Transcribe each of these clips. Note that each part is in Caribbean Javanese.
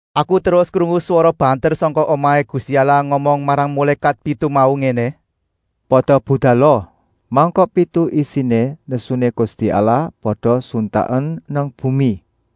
Aku terus krungu swara banter sangka omahé Gusti Allah ngomong marang mulékat pitu mau ngéné: “Pada budala! Mangkok pitu isiné nesuné Gusti Allah pada suntaken nang bumi!”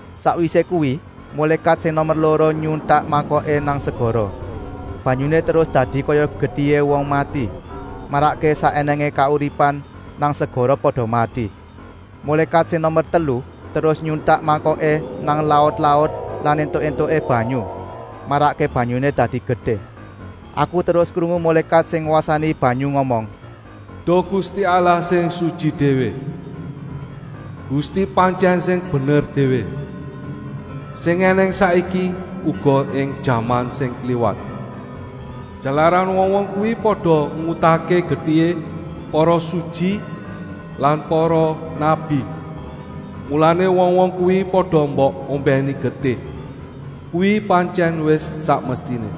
Sakwisé kuwi mulékat sing nomer loro nyuntak mangkoké nang segara. Banyuné terus dadi kaya getihé wong mati, marakké sak ènèngé kauripan nang segara pada mati. Mulékat sing nomer telu terus nyuntak mangkoké nang laut-laut lan etuk-etuké banyu, marakké banyuné dadi getih. Aku terus krungu mulékat sing ngwasani banyu ngomong: “Duh Gusti Allah sing sutyi déwé! Gusti pantyèn sing bener déwé, sing ènèng saiki, uga ing jaman sing kliwat. Jalaran wong-wong kuwi pada ngutahké getihé para sutyi lan para nabi, mulané wong-wong kuwi pada mbok ombèni getih. Kuwi pantyèn wis sak mestiné.”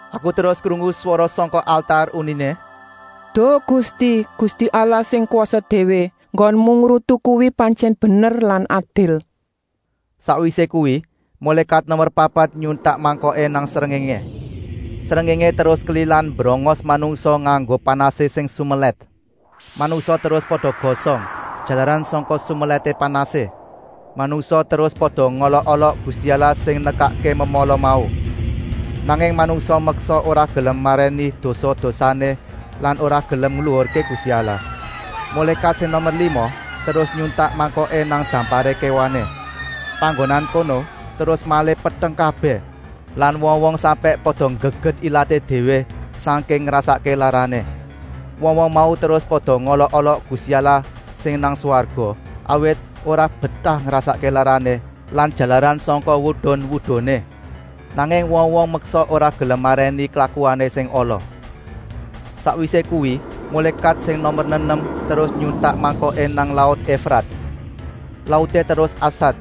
Aku terus krungu swara sangka altar, uniné: “Duh Gusti, Gusti Allah sing kwasa déwé, enggonmu ngrutu kuwi pantyèn bener lan adil.” Sakwisé kuwi mulékat nomer papat nyuntak mangkoké nang srengéngé. Srengéngé terus kelilan mbrongos manungsa nganggo panasé sing sumelèt. Manungsa terus pada gosong, jalaran sangka sumelèté panasé. Manungsa terus pada ngolok-olok Gusti Allah sing nekakké memala mau. Nanging manungsa meksa ora gelem marèni dosa-dosané lan ora gelem ngluhurké Gusti Allah. Mulékat sing nomer lima terus nyuntak mangkoké nang damparé kéwané. Panggonan kono terus malih peteng kabèh lan wong-wong sampèk pada nggeget ilaté déwé sangking ngrasakké larané. Wong-wong mau terus pada ngolok-olok Gusti Allah sing nang swarga, awit ora betah ngrasakké larané lan jalaran sangka wudun-wuduné. Nanging wong-wong meksa ora gelem marèni klakuané sing ala. Sakwisé kuwi mulékat sing nomer nenem terus nyuntak mangkoké nang laut Efrat. Lauté terus asat,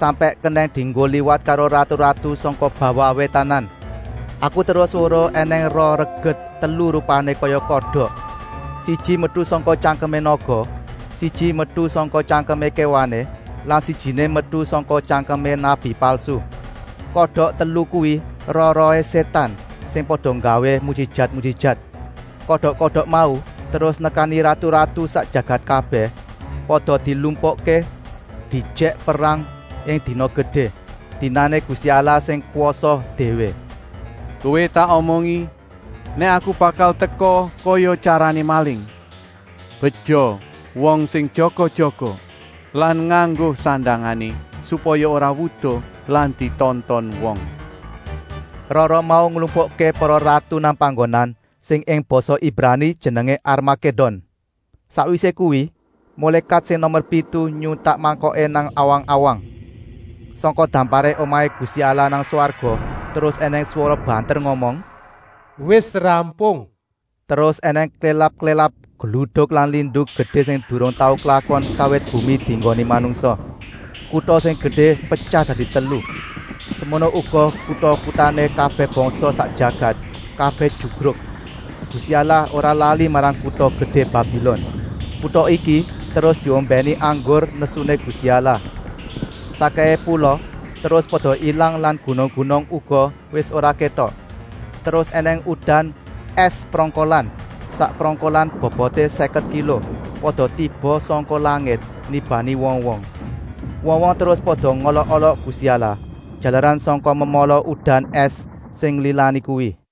sampèk kenèng dienggo liwat karo ratu-ratu sangka bawah wétanan. Aku terus weruh ènèng roh reget telu rupané kaya kodok. Siji metu sangka tyangkemé naga, siji metu sangka tyangkemé kéwané lan sijiné metu sangka tyangkemé nabi palsu. Kodok telu kuwi roh-rohé sétan sing pada nggawé mujijat-mujijat. Kodok-kodok mau terus nekani ratu-ratu sak jagat kabèh, pada dilumpukké diejèk perang ing dina gedé, dinané Gusti Allah sing kwasa déwé. “Kowé tak omongi nèk Aku bakal teka kaya tyarané maling. Beja wong sing jaga-jaga lan nganggo sandangané, supaya ora wuda lan ditonton wong.” Roh-roh mau nglumpukké para ratu nang panggonan sing ing basa Ibrani jenengé Armakédon. Sakwisé kuwi, mulékat sing nomer pitu nyuntak mangkoké nang awang-awang. Sangka damparé omahé Gusti Allah nang swarga terus ènèng swara banter ngomong: “Wis rampung!” Terus ènèng klélap-klélap, gluduk lan lindu gedé sing durung tau klakon kawit bumi dienggoni manungsa. Kuta sing gedé petyah dadi telu. Semono uga kuta-kutané kabèh bangsa sak jagat, kabèh jugruk. Gusti Allah ora lali marang kuta gedé Babilon. Kuta iki terus diombèni anggur nesuné Gusti Allah. Sakkèhé pula terus pada ilang lan gunung-gunung uga wis ora kétok. Terus ènèng udan ès prongkolan, sak prongkolan boboté sèket kilo, pada tiba sangka langit, nibani wong-wong. Wong-wong terus pada ngolok-olok Gusti Allah, jalaran sangka memala udan ès sing nggilani kuwi.